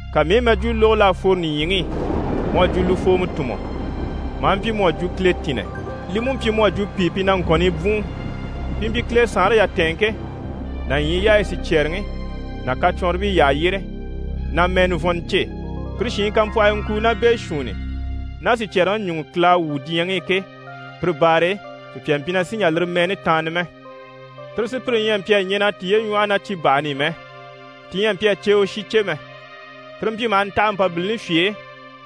Ka mii i mɛjwuu lógo l'à fworo nìɲyiŋi i mu à jwo lufoomɔ tùnmɔ, maa mpyi mu à jwo kiletinnɛ. Li mú mpyi mu à jwo pìi pi ɲyɛ na ŋkɔ̀nnii bwùun. Pi mpyi Kile saanre yatɛɛnŋke ná ɲyii yaayi sicyɛɛreŋi ná kacwɔnribii yyaha yyére na mɛɛ nivɔnnɔ cêe. Pire shiin kampwɔhii ŋkuu ná beeshuunni ná sicyɛɛreŋi ɲùŋɔ Kile à wwû diɲyɛŋi i ke, pire baare e, sùpya mpyi na sì n‑jà lire mɛɛni taanna mɛ. Tire sùpyire ɲyɛ a mpyi a ɲɛn'a tiye ɲwɔ́hɔ ná cibahani i mɛ. Ti ɲyɛ a mpyi a ceewe shi cè mɛ. Tire mpyi maha ntaha Mpabilini fye e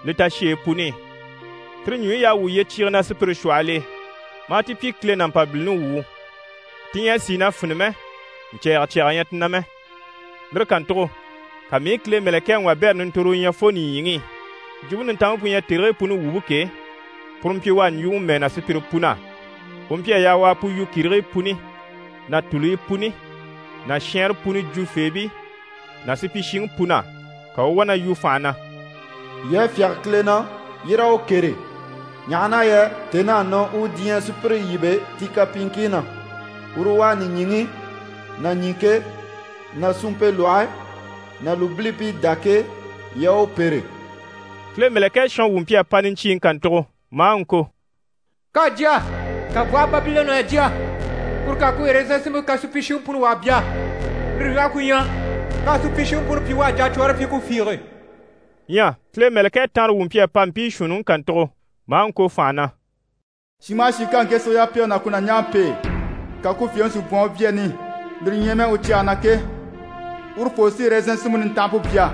li tasheyi puni i. Tire ɲùɲyi y'à wwû yyecyiige na sùpyire shwɔhɔl'e, maa ti pyi Kile ná Mpabilini wuu. Ti ɲyɛ a sìi na fini mɛ, ɲcɛ̀ɛgɛ cyaga ɲyɛ ti na mɛ. Lire kàntugo ka mii i Kile mɛ̀lɛkɛŋi wabɛrɛ nintorowo ɲya fo nìɲyiŋi i. Jwumpe Nintanmpe pu ɲyɛ tèrigii puni wumpe ke, puru mpyi u á ɲjwuŋi mɛɛ na sùpyire pun'á. U mpyi a yaa u a pu yu kìrigii puni ná tùluyi puni ná shɛɛnre puni jwufeebii ná supyishiŋi pun'á. Ka u u wá na yu fànha na: «Yii a fyáge Kile na, yii raa u kêre, ɲaha na yɛ tèn'à nɔ u diɲyɛ sùpyire yíbe ti kapyiiŋkii na. Uru u à nìɲyiŋi ná ɲìŋke ná suumpe lwɔhe ná lùbilibii dá ke, yii a u pêre.» Kile mɛ̀lɛkɛ shɔnwu mpyi a pa niɲcyiiŋi kàntugo maa ŋko: «K'à jya! Kànbwɔhe Babilɔnni à jya! Kuru k'à ku ɛrɛzɛn sinmpe kan supyishiŋi puni u a bya. Lire ɲwɔhe ku ɲyɛ, k'à supyishiŋi puni pyi u à jacwɔɔre pyi ku fiige.» Ɲyɛ Kile mɛ̀lɛkɛ tanrewu mpyi a pa mpii shuunniŋi kàntugo, maa ŋko fànha na: «Shin maha shin ká ŋke sige yapege ná ku nàɲjaŋi pêe, ka ku fyèŋi si bwɔ̀n u byaani, lire ɲyɛ mɛ u cyɛge na ke, urufoo sí ɛrɛzɛnŋi sinmpe nintanhampe bya.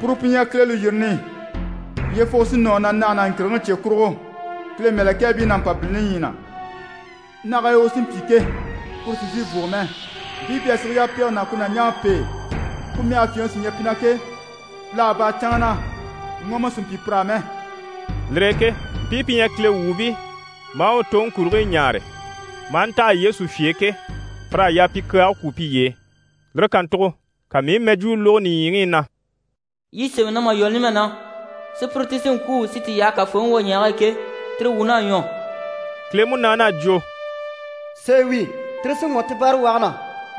Puru pu ɲyɛ Kile lùyirini. Yyefuge sí nɔ u na nage ná ŋkìrigiŋi cye kurugo, Kile mɛ̀lɛkɛɛbii ná Mpabilini ɲyii na. Nage e u sí n‑pyi ke, kuru sì n‑sìi n-fùgo mɛ. Mpii pi à sige yapege ná ku nàɲjaŋi pêe, ku mɛge fyèŋi sí ɲyɛ pi na ke, pìlaga bâra canŋa na, ŋɔmɔ sì n‑pyi pir'á mɛ.» Lire e ke mpii pi ɲyɛ Kile wuubii, maa u toŋi kurigii ɲaare maa ntaha Yesu fye e ke, pir'à yaa pi kyaage kwú piye e. Lire kàntugo ka mii i mɛjwuu lógo nìɲyiŋi i na: «Yi sémɛ na mà lwɔ́ numɛ na, sùpyire ti sí n‑kwû si ti yaha Kafooŋi wwoɲɛɛge e ke, tire wuun'à ɲwɔ.» Kile Munaani à jwo: «Sèe wi, tire sí ŋɔ̀ ti báarawage na,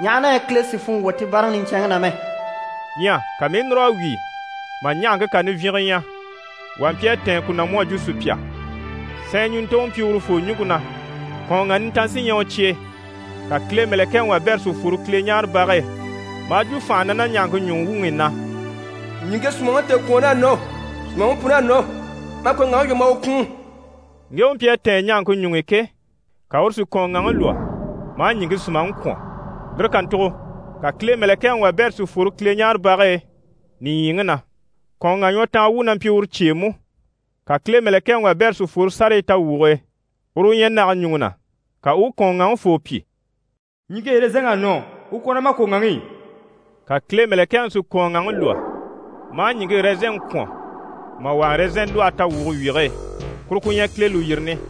ɲaha na yɛ Kile sì funŋɔ wwɔ̀ ti báaraŋi niɲcɛnŋi na mɛ.» Ɲyɛ ka mii i núr'a wíi mà ɲahaŋke kà nivyinge ɲya, wà mpyi a tɛ̀ɛn ku na mu à jwo sùpya. Sɛɛn ɲùntoŋɔ mpyi urufoo ɲùŋke na, kɔ̀ɔnŋa nintan sí ɲyɛ u cyɛge e. Ka Kile mɛ̀lɛkɛŋi wabɛrɛ si fworo Kileɲaarebage e, maa jwo fànha na ná ɲahaŋke ɲùŋi wuŋi i na: «Ɲìŋke sùmaŋi tèekwɔɔnn'à nɔ, sùmaŋi pun'à nɔ, ma kɔ̀ɔnŋaŋi lwɔ́ ma a u kwùun.» Ŋge u mpyi a tɛ̀ɛn ɲahaŋke ɲuŋ'i ke, ka uru si u kɔ̀ɔnŋaŋi lwɔ́, maa ɲìŋke sùmaŋi kwɔ̀n. Lire kàntugo ka Kile mɛ̀lɛkɛŋi wabɛrɛ si fworo Kileɲaarebage e nìɲyiŋi na, kɔ̀ɔnŋa ɲwɔtanga wu na mpyi uru cye e mú. Ka Kile mɛ̀lɛkɛŋi wabɛrɛ si fworo sárayi tawwuge e, uru u ɲyɛ nage ɲùŋɔ na. Ka u u kɔ̀ɔnŋaŋifoo pyi: «Ɲìŋke ɛrɛzɛnŋ'à nɔ, u kwɔ̀n ná ma kɔ̀ɔnŋaŋi i.» Ka Kile mɛ̀lɛkɛŋi si u kɔ̀ɔnŋaŋi lwɔ́, maa ɲìŋke ɛrɛzɛnŋi kwɔ̀n mà wà ɛrɛzɛn lwɔhe tawwuge wyige e. Kuru ku ɲyɛ Kile lùyirini.